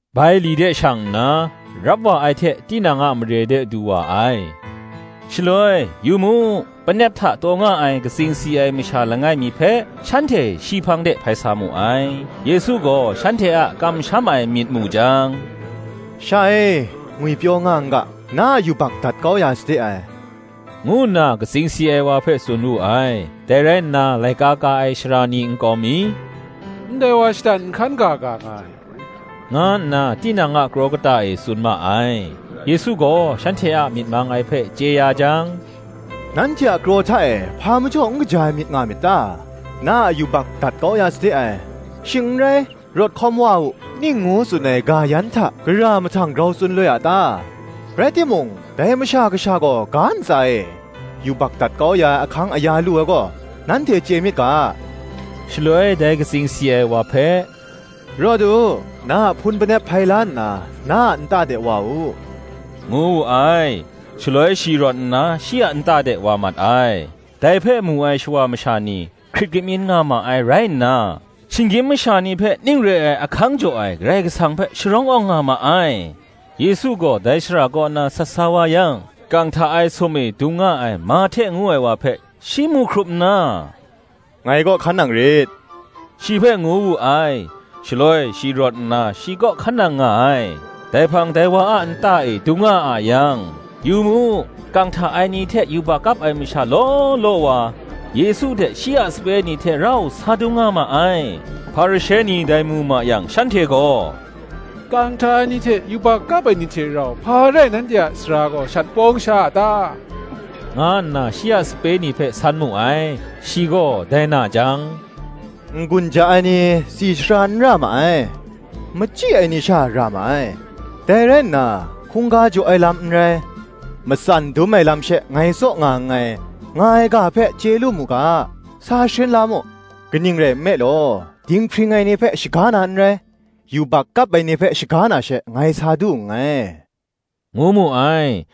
Bai li de shi shang nna, rap wa ai hte tinang a mare de du wa ai. Shaloi, Yu mu, panep hta taw nga ai katsing si ai masha langai mi hpe, shanhte shi hpang de hpai sa mu ai. Yesu gaw shanhte a kamsham ai myit mu jang, “Sha e, ngwipyaw nga n ga; na a yubak dat kau ya sade ai,” ngu nna katsing si ai wa hpe tsun wu ai. Dai rai nna laika ka ai sara ni nkau mi, “Ndai wa shatan nhkan ga ga nga ai,” nga nna tinang a kraw kata e tsun ma ai. Yesu gaw shanhte a myit mang ai hpe chye ya jang, “Nanhte a kraw hta e, hpa majaw n kaja ai myit nga myit ta? Na a yubak dat kau ya sade ai; shing n rai, Rawt hkawm wa u, ning ngu tsun ai ga yan hta, gara mahtang grau tsun loi a ta? Rai timung, dai Masha Kasha gaw ga ntsa e, yubak dat kau ya ai ahkang aya lu ai gaw, nanhte chye myit ga, shaloi dai katsing si ai wa hpe, Rawt u, na a hpun panep hpai la nna, na a nta de wa u,” ngu wu ai. Shaloi shi rawt nna shi a nta de wa mat ai. Dai hpe mu ai shawa masha ni, hkrit kamyin nga ma ai rai nna, shinggyim masha ni hpe ning re ai ahkang jaw ai Karai Kasang hpe sharawng awng nga ma ai. Yesu gaw dai shara kaw na sat sa wa yang, kang hta ai sum e dung nga ai Mahte ngu ai wa hpe shi mu hkrup nna, “Ngai kaw hkan nang rit,” shi hpe ngu wu ai: shaloi shi rawt nna shi kaw hkan nang nga ai. Dai hpang dai wa a nta e dung nga a yang, yu mu, kang hta ai ni hte yubak kap ai masha law law wa, Yesu hte shi a sape ni hte rau sa dung nga ma ai. Hparishe ni dai mu ma yang shanhte gaw, “Kang hta ai ni hte yubak kap ai ni hte rau, hpa rai nanhte a sara gaw shat pawng sha a ta?” nga nna shi a sape ni hpe san mu ai. Shi gaw dai na jang, “N-gun ja ai ni tsi sara n ra ma ai; machyi ai ni sha ra ma ai. Dai rai nna, Hkungga jaw ai lam n rai, matsan dum ai lam she ngai tsaw nga nngai, nga ai ga hpe chye lu mu ga, sa sharin la mu: Kaning rai nme law, dinghpring ai ni hpe shaga na n rai, yubak kap ai ni hpe shaga na she ngai sa du nngai,” ngu mu ai.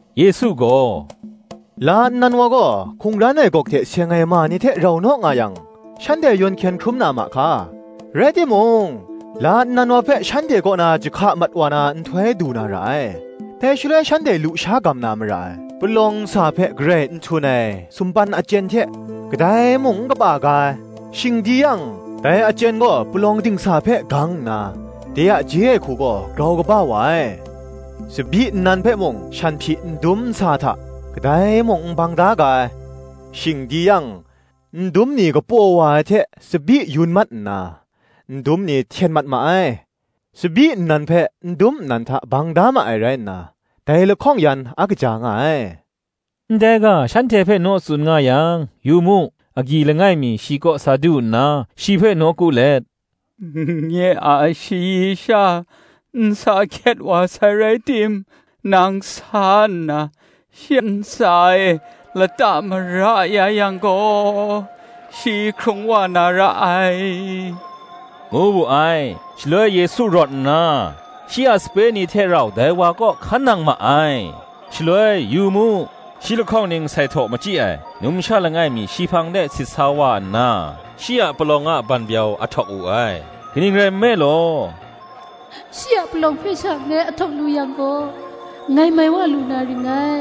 Yesu gaw, “La nnan wa gaw, hkungran ai gawk hte seng ai ma ni hte rau naw nga yang, shanhte yawn hkyen hkrum na ma hka? Rai timung? la nnan wa hpe shanhte kaw na jahka mat wa na nhtoi du na ra ai; dai shaloi shanhte lusha gam na mara ai. Palawng nsa hpe garai n htun ai sumpan achyen hte kadai mung n kapa ga ai; shing di yang, dai achyen gaw palawng dingsa hpe gang nna, de a je ai hku gaw grau kaba wa ai. Tsabyi nnan hpe mung shanhpyi ndum nsa hta, kadai mung n bang da ga ai: shing di yang, ndum ni kapaw wa ai hte tsabyi yun mat nna, ndum ni hten mat ma ai: tsabyi nnan hpe ndum nnan hta bang da ma ai rai nna, dai lahkawng yan a kaja nga ai.” Ndai ga shanhte hpe naw tsun nga yang, yu mu, agyi langai mi shi kaw sa du nna, shi hpe nawku let, “Nye a shayi sha nsa hkyet wa sai raitim, nang sa nna shi ntsa e lata mara ya yang gaw, shi hkrung wa na ra ai,” ngu wu ai. Shaloi Yesu rawt nna, shi a sape ni hte rau dai wa kaw hkan nang ma ai. Shaloi, yu mu, shi lahkawng ning sai htaw machyi ai numsha langai mi shi hpang de sit sa wa nna, shi a palawng a banbyau ahtawk wu ai; kaning rai nme law, “Shi a palawng hpe sha ngai ahtawk lu yang gaw, ngai mai wa lu na ring ngai,”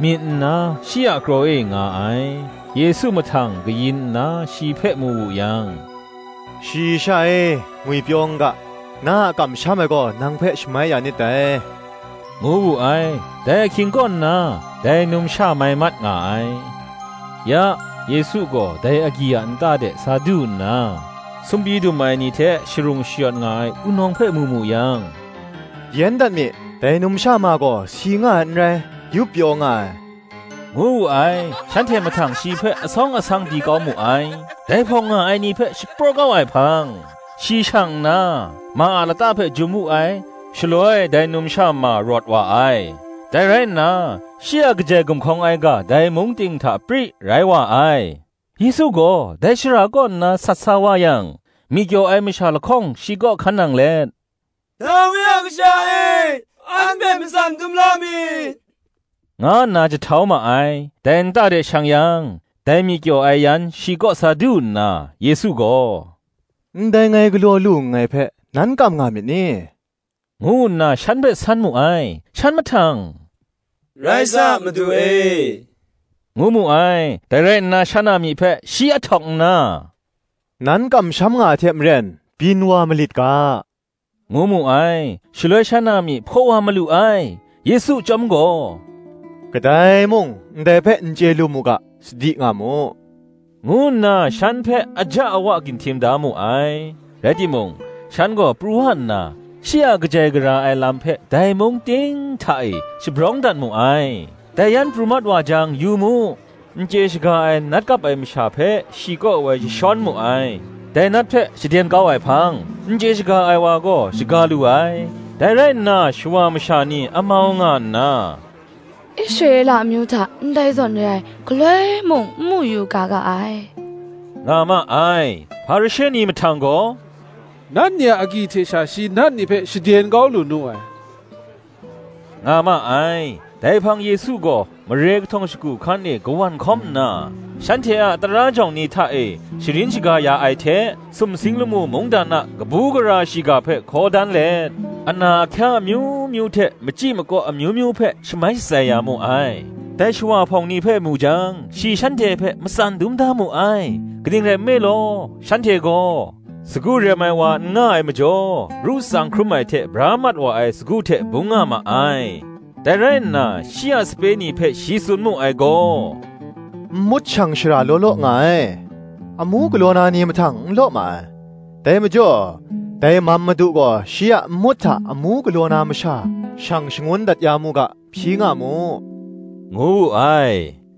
myit nna shi a kraw e nga ai. Yesu mahtang kayin nna shi hpe mu wu yang, “Shayi sha e, ngwipyaw n ga; na a kamsham ai gaw nang hpe shamai ya nit dai,” ngu wu ai. Dai ahkying kaw nna, dai numsha mai mat nga ai. Ya, Yesu gaw dai agyi a nta de sa du nna, sumpyi dum ai ni hte sharung shayawt nga ai wunawng hpe mu mu yang, “Yen dat mi, dai numsha ma gaw si nga ai n rai, yup pyaw nga ai,” ngu wu ai. Shanhte mahtang shi hpe asawng asang di kau mu ai. Dai hpawng nga ai ni hpe shapraw kau ai hpang, shi shang nna, ma a lata hpe jum wu ai; shaloi dai numsha ma rawt wa ai. Dai rai nna, shi a kajai gumhkawng ai ga dai mung ting hta pri rai wa ai. Yesu gaw dai shara kaw nna sat sa wa yang, myi kyaw ai masha lahkawng shi kaw hkan nang let, “Dawi a kasha e, an hpe matsan dum la mi,” nga nna jahtau ma ai. Dai nta de shang yang, dai myi kyaw ai yan shi kaw sa du nna, Yesu gaw, “Ndai ngai galaw lu nngai hpe, nan kam nga myit ni?” ngu nna shan hpe san mu ai. Shan mahtang, Rai sa, Madu e, ngu mu ai. Dai rai nna shan a myi hpe shi ahtawk nna, “Nan kamsham nga ai hte maren, byin wa malit ga,” ngu mu ai. Shaloi shan a myi hpaw wa malu ai. Yesu chyawm gaw, “Kadai mung, ndai hpe n chye lu mu ga, sadi nga mu,” ngu nna shan hpe aja awa ginhtim da mu ai. Rai timung, shan gaw pru wa nna, shi a kajai gara ai lam hpe dai mung ting hta e shabrawng dat mu ai. Dai yan pru mat wa jang, yu mu, n chye shaga ai nat kap ai masha hpe shi kaw woi jashawn mu ai. Dai nat hpe shaden kau ai hpang, n chye shaga ai wa gaw shaga lu ai. Dai rai nna, shawa masha ni amau nga nna, “Israela amyu hta ndai zawn re ai, galoi mung n mu yu ga ga ai,” nga ma ai. [Hparishe ni mahtang gaw, “Nat ni a agyi hte sha, shi nat ni hpe shaden kau lu nu ai,” nga ma ai.] Dai hpang Yesu gaw, mare kahtawng shagu hkan e kawan hkawm nna, shanhte a tara jawng ni hta e sharin shaga ya ai hte sumsing lamu mungdan a kabu gara shiga hpe hkaw dan let, ana ahkya amyu myu hte machyi makaw amyu myu hpe shamai shatsai ya mu ai. Dai shawa hpawng ni hpe mu jang, shi shanhte hpe matsan dum da mu ai: kaning rai nme law, shanhte gaw, sagu rem ai wa n nga ai majaw, ru tsang hkrum ai hte bra mat wa ai sagu hte bung nga ma ai. Dai rai nna, shi a sape ni hpe shi tsun mu ai gaw, “Nmut shang shara law law nga ai, amu galaw na ni mahtang n law ma ai: dai majaw, dai mam Madu gaw shi a nmut hta amu galaw na masha shang shangun dat ya mu ga, hpyi nga mu,” ngu wu ai.